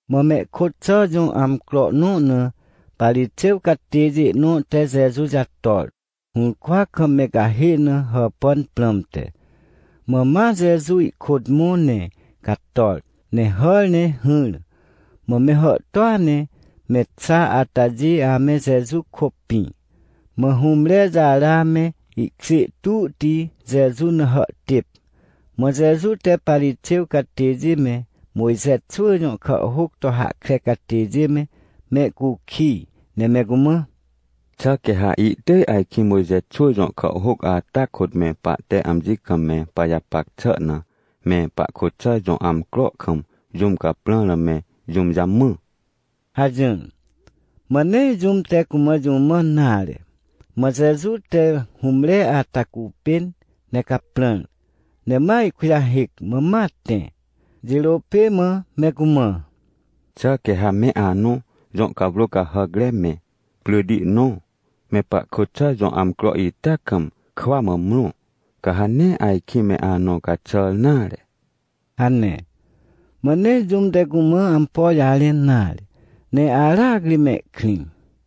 Mã mehkôt xà jõ amcro nõ na Parixêw catêjê nõ te Jeju jator, hũrkwa kam me cahê na hàpàn prãmte. Mã ma Jeju ihkôt mõ, ne cator, ne hàr ne hỹr. Mã me hàhtôa ne me xa atajê ame Jeju kôpĩ. Mã hũmre jara me ihkjê tuhti Jeju na hàhtêp. Mã Jeju te Parixêw catêjê me, Mojxe xwỳ jõ kàhhôc to hahkre catêjê me, mehcukij ne me cumã: ― Xà quê ha ihtỳj ajkĩ Mojxe xwỳ jõ kàhhôc ata kôt me pahte amji kam me pajapac xà na, me pahkôt xà jõ amcro kam jũm caprãr na me jũm jamã? ― hajỹr. Mã nee jũm te cumã jũ mãn nare. Mã Jeju te hũmre ata cupên ne caprãr, ne ma ihkujahêc, mã ma tẽ. Jirô pê mã me cumã: ― Xà quê ha me anõ jõ cawrô cahàcre me, pryti nõ, me pahkôt xà jõ amcro ita kam, kwa mã mrõ, ca ha nee ajkĩ me anõ caxàr nare? ― hane. Mã nee jũm te cumã ampo jarẽn nare, ne aracri mehkrĩ.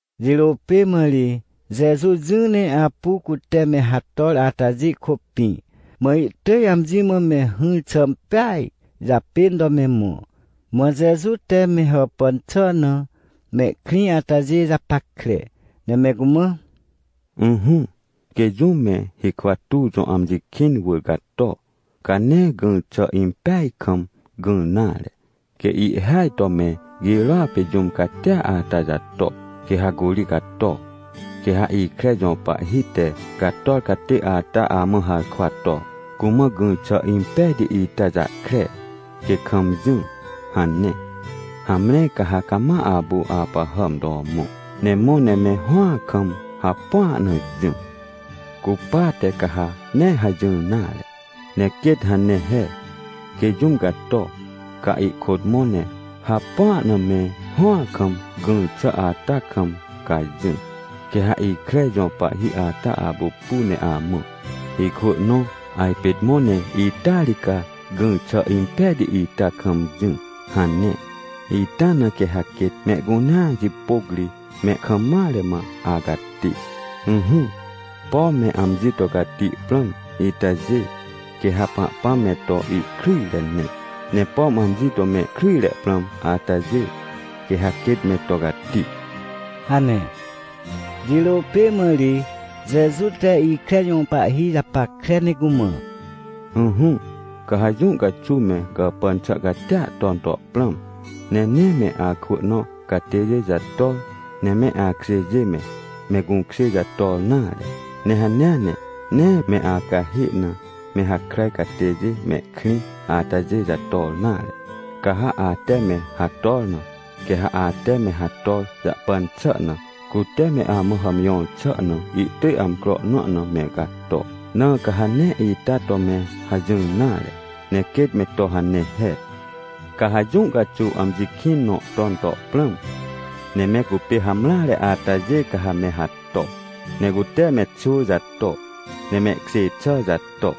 Jirô pê mã ri Jeju jỹ ne apu cute me hator atajê kôpĩ, mã ihtỳj amji mã me hỹr xà impeaj japên to me mõ. Mã Jeju te me hàpàn xà na mehkrĩ atajê japackre, ne me cumã: ― Ỹhỹ, quê jũm me hikwa tuw jõ amji kĩn wỳr gato, ca nee gỹr xà impeaj kam gỹr nare. Quê ihhêaj to me girôa pê jũm catia ata jato, quê ha curi cato. Quê ha ikre jõ pahhi te gator catê ata amã harkwa to: “Cumã gỹr xà impejti ita jahkre, quê kam jỹ” hane. Hamre, ca ha cama apu apahàm to mõ, ne mõ ne me hõa kam hapua na jỹ. Cupate ca ha nee hajỹr nare, ne quêt hane he. Quê jũm gato, ca ihkôt mõ ne hapua na me hõa kam, gỹr xà ata kam ca jỹ. Quê ha ikre jõ pahhi ata apupu ne amã: “Ikwỳ nõ, ajpên mõ ne ita ri ca gỹr xà impejti ita kam jỹ” hane. Ita na quê ha quêt mehcunea jipôc ri me kam mare mã acati. ― Ỹhỹ, pom me amji to cati prãm itajê, quê ha Pahpãm me to ihkryjre ne. Ne pom amji to mehkryjre prãm atajê, quê ha quêt me to cati ― hane. Jirô pê mã ri Jeju te ikre jõ pahhi japackre ne cumã: ― Ỹhỹ, ca ha jũ caxuw me gàpàn xà catia ton to prãm, ne nee me akwỳ nõ catêjê jator, ne me akjêjê me, me gũkjê jator nare. Ne hanea ne nee me acahê na me hakràj catêjê mehkrĩ atajê jator nare. Ca ha ate me hator na, quê ha ate me hator jahpan xà na, cute me amã hàmjõr xà na ihtỳj amcro nõ na me gato. Na ca ha nee ita to me hajỹr nare, ne quêt me to hane he. ― Ca ha jũ caxuw amji kĩn nõ ton to prãm, ne me cupê hamreare atajê ca ha me hato, ne cute me xwỳ jato, ne mehkjê xà jato,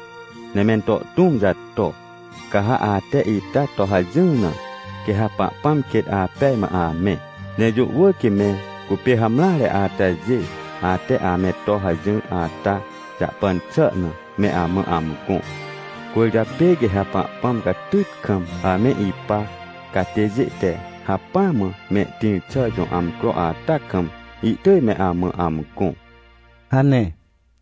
ne mento tũm jato. Ca ha ate ita to hajỹr na, quê ha Pahpãm quêt apej mã amẽ. Ne jũ wỳr quê me cupê hamreare atajê, ate ame to hajỹr ata jahpan xà na, me amã amgõ. Cwỳrjapê quê ha Pahpãm, catyt kam ame ipa catêjê te hacpỹa mã mehtĩr xà jõ amcro ata kam, ihtỳj me amã amgõ ― hane.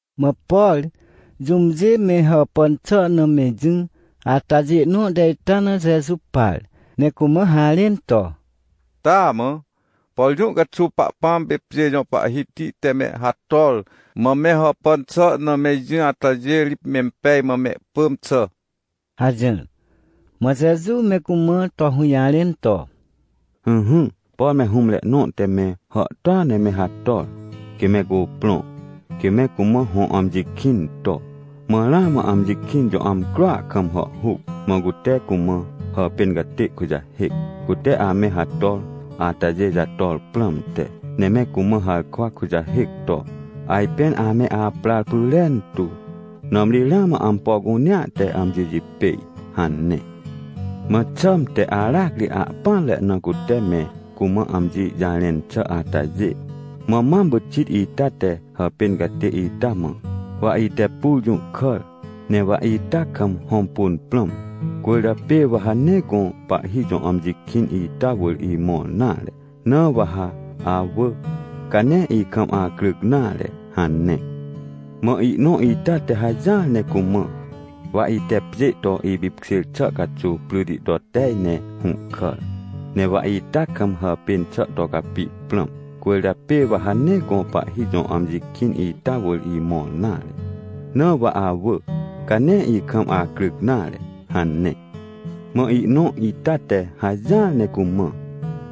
Mã por jũmjê me hàpàn xà na me jỹ atajê nõ te ita na Jeju par, ne cumã harẽn to: ― Taamã, por jũ caxuw Pahpãm pê pjê jõ Pahhiti te me hator, mã me hàpàn xà na me jỹ atajê ri mempej mã mehpỳm xà ― hajỹr. Mã Jeju me cumã to hũjarẽn to: ― Ỹhỹ, por me hũmre nõ te me hàhtôa ne me hator, quê me cuprõ, quê me cumã hõ amji kĩn to. Mã ramã amji kĩn jõ amcroa kam hàhhuc, mã cute cumã hàpên catê kujahêc, cute ame hator atajê jator prãmte. Ne me cumã harkwa kujahêc to: “Ajpên ame aprar pyrentu, nãmri ramã ampo cunea te amji jipêj” hane. ― Mã xãmte aracri ahpỹanre na cute me cumã amji jarẽn xà atajê. Mã mam pyxit ita te hàpên catê ita mã: “Wa ite pur jũhkàr, ne wa ita kam hõmpun prãm, cwỳrjapê wa ha nee gõ pahhi jõ amji kĩn ita wỳr imõr nare. Na wa ha awỳ, ca nee ikam acryc nare” hane. ― Mã ihnõ ita te hajỹar ne cumã: “Wa ite pjê to ipipkjêr xà caxuw pryti to tej ne hũhkàr, ne wa ita kam hàpên xà to capi prãm, cwỳrjapê wa ha nee gõ pahhi jõ amji kĩn ita wỳr imõr nare. Na wa awỳ, ca nee ikam acryc nare” hane. ― Mã ihnõ ita te hajỹar ne cumã: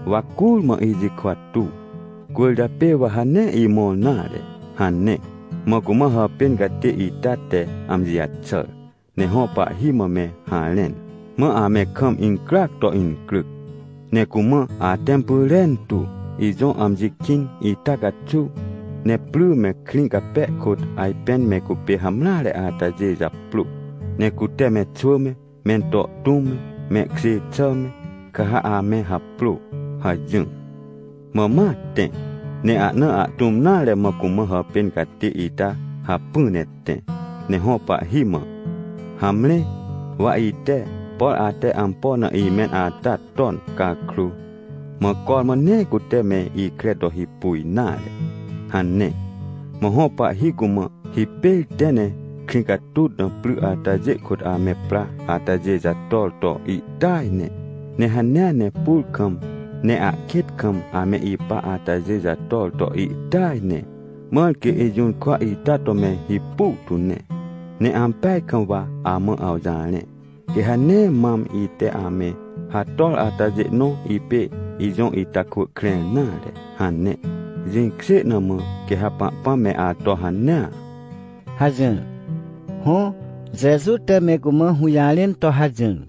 “Wa curmã ijikwa tuw, cwỳrjapê wa ha nee imõr nare” hane. ― Mã cumã hàpên catê ita te amji jaxàr, ne hõ pahhi mã me harẽn. Mã ame kam incryac to incryc, ne cumã: “Atẽm pyrentu, ijõ amji kĩn ita caxuw, ne pry me krĩ cape kôt ajpên me cupê hamreare atajê japrô, ne cute me xwỳ me, mento tũm me, mehkjê xà me, ca ha ame haprô” hajỹr. ― Mã ma tẽ, ne ahna ahtũm nare mã cumã hàpên catê ita hacpỹ ne tẽ ne hõ pahhi mã: “Hamre, wa ite, por ate ampo na imẽn ata ton cakrô, mã cormã nee cute me ikre to hipu nare” hane. ― Mã hõ pahhi cumã: “Hipêr tẽ ne krĩ catut na pry atajê kôt ame pra atajê jator to ihtỳaj ne, ne hanea ne pur kam ne ahkêt kam ame ipa atajê jator to ihtỳaj ne, mãr quê ijũrkwa ita to me hipu tu ne. Ne ampeaj kam wa amã awjarẽ, quê ha nee mam ite ame hator atajê nõ ipê ijõ ita kwỳ krẽr nare” hane. Jĩkjê na mã quê ha Pahpãm me ato hanea ― hajỹr. Hõ, Jeju te me cumã hũjarẽn to hajỹr.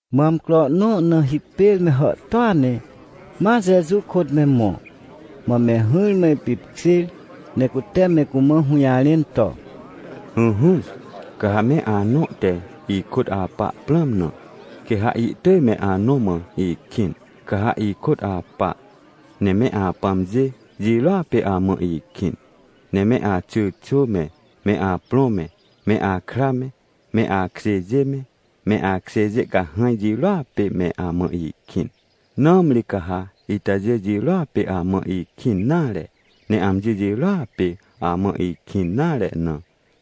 Mã amcro nõ na hipêr me hàhtôa ne ma Jeju kôt me mõ, mã me hỹrmã ipipkjêr ne cute me cumã hũjarẽn to: ― Ỹhỹ, ca ha me anõ te ikôt apa prãm na, quê ha ihtỳj me anõ mã ikĩn, ca ha ikôt apa. Ne me apãmjê jirôa pê amã ikĩn, ne me axyrxwỳ me, me aprõ me, me akra me, me akjêjê me, me akjêjê cahãj jirôa pê me amã ikĩn. Nãmri ca ha itajê jirôa pê amã ikĩn nare, ne amji jirôa pê amã ikĩn nare na,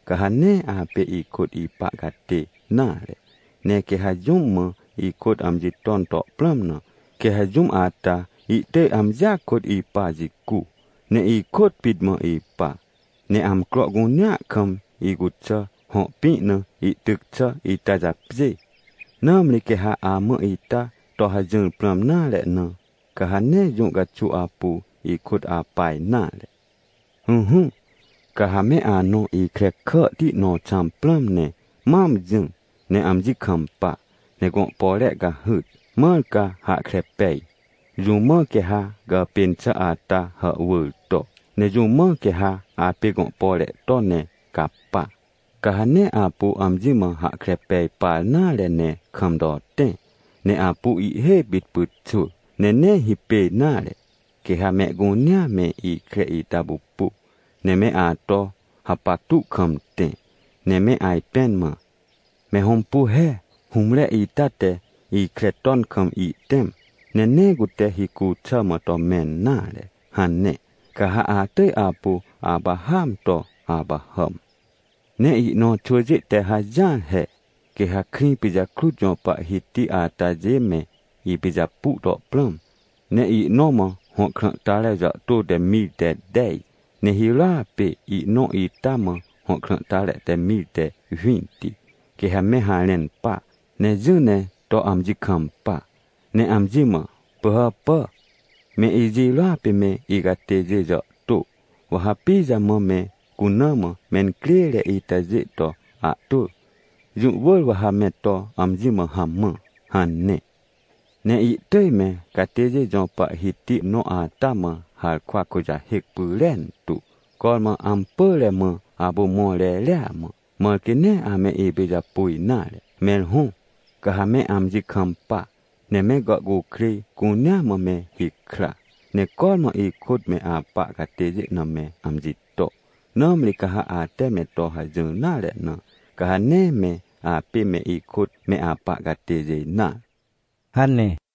ca ha nee apê ikôt ipa catê nare. Ne quê ha jũm mã ikôt amji ton to prãm na, quê ha jũm ata ihtỳj amjia kôt ipa jicu, ne ikôt pit mã ipa, ne amcro cunea kam icuxà, hõ pĩ na ihtyc xà ita japjê. Nãmri quê ha amã ita to hajỹr prãm nare na, ca ha nee jũ caxuw apu ikôt apa nare. ― Ỹhỹ, ca ha me anõ ikre kàhti nõ xãm prãm, ne mam jỹ ne amji kampa, ne gõ pore cahyt, mãr ca hahkre pej, jũ mã quê ha gàpên xà ata hàhwỳr to. Ne jũ mã quê ha apê gõ pore to ne capa. Ca ha nee apu amji mã hahkre pej par nare ne kam to tẽ, ne apu ihhê pit pyxwỳ, ne nee hipêj nare. Quê ha mehcunea me ikre ita pupu, ne me ato hapactu kam tẽ, ne me ajpẽn mã, “Me hõmpu he, hũmre ita te ikre ton kam ihtẽm, ne nee cute hicu xà mã to mẽn nare” hane. Ca ha atỳj apu apahàam to apahàm. ― Ne ihnõ xwỳjê te hajỹar he. Quê ha krĩ pijakrut jõ pahhiti atajê me ipijapu to prãm, ne ihnõ mã hõ krãhtare jàhtô te mir te tej, ne hirôa pê ihnõ ita mã hõ krãhtare te mir te winti. Quê ha me harẽn pa, ne jỹ ne to amji kampa, ne amji mã: “Pỳhàpà, me ijirôa pê me icatêjê jàhtô, wa ha pijamã me cuna mã mencrêre itajê to ahtwỳ? Jũ wỳr wa ha me to amji mã hamã” hane. Ne ihtỳj me catêjê jõ pahhiti nõ ata mã harkwa kujahêc pyrentu, cormã ampỳre mã apu mõr reria mã, mãr quê nee ame ipijapu nare. ― Mẽr hõ, ca ha me amji kampa, ne me gàhcukrêj cunea mã me hikra, ne cormã ikôt me apa catêjê na me amji to. Nãmri ca ha ate me to hajỹr nare na, ca ha nee me apê me ikôt me apa catêjê nare ― hane.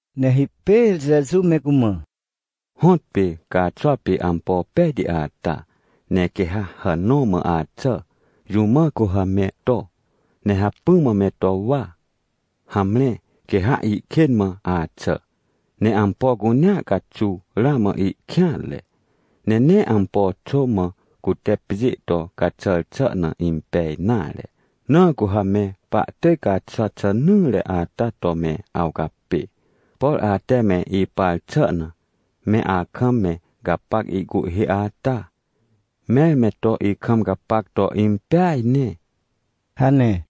Ne hipêr Jeju me cumã: ― Hõtpê caaxwa pê ampo pejti ata, ne quê ha hàn nõ mã axà, jũ mã cu ha me to, ne hacpỹ mã me to wa? Hamre, quê ha ihkên mã axà, ne ampo cunea caxuw ramã ihkêanre, ne nee ampo xô mã cute pjê to caxà xà na impej nare. Na cu ha me pahtỳj caaxwa xen nỹre ata to me awcapê. Por ate me ipar xà na, me akam me gapac ihcuhhê ata, mẽr me to ikam gapac to impeaj ne ― hane.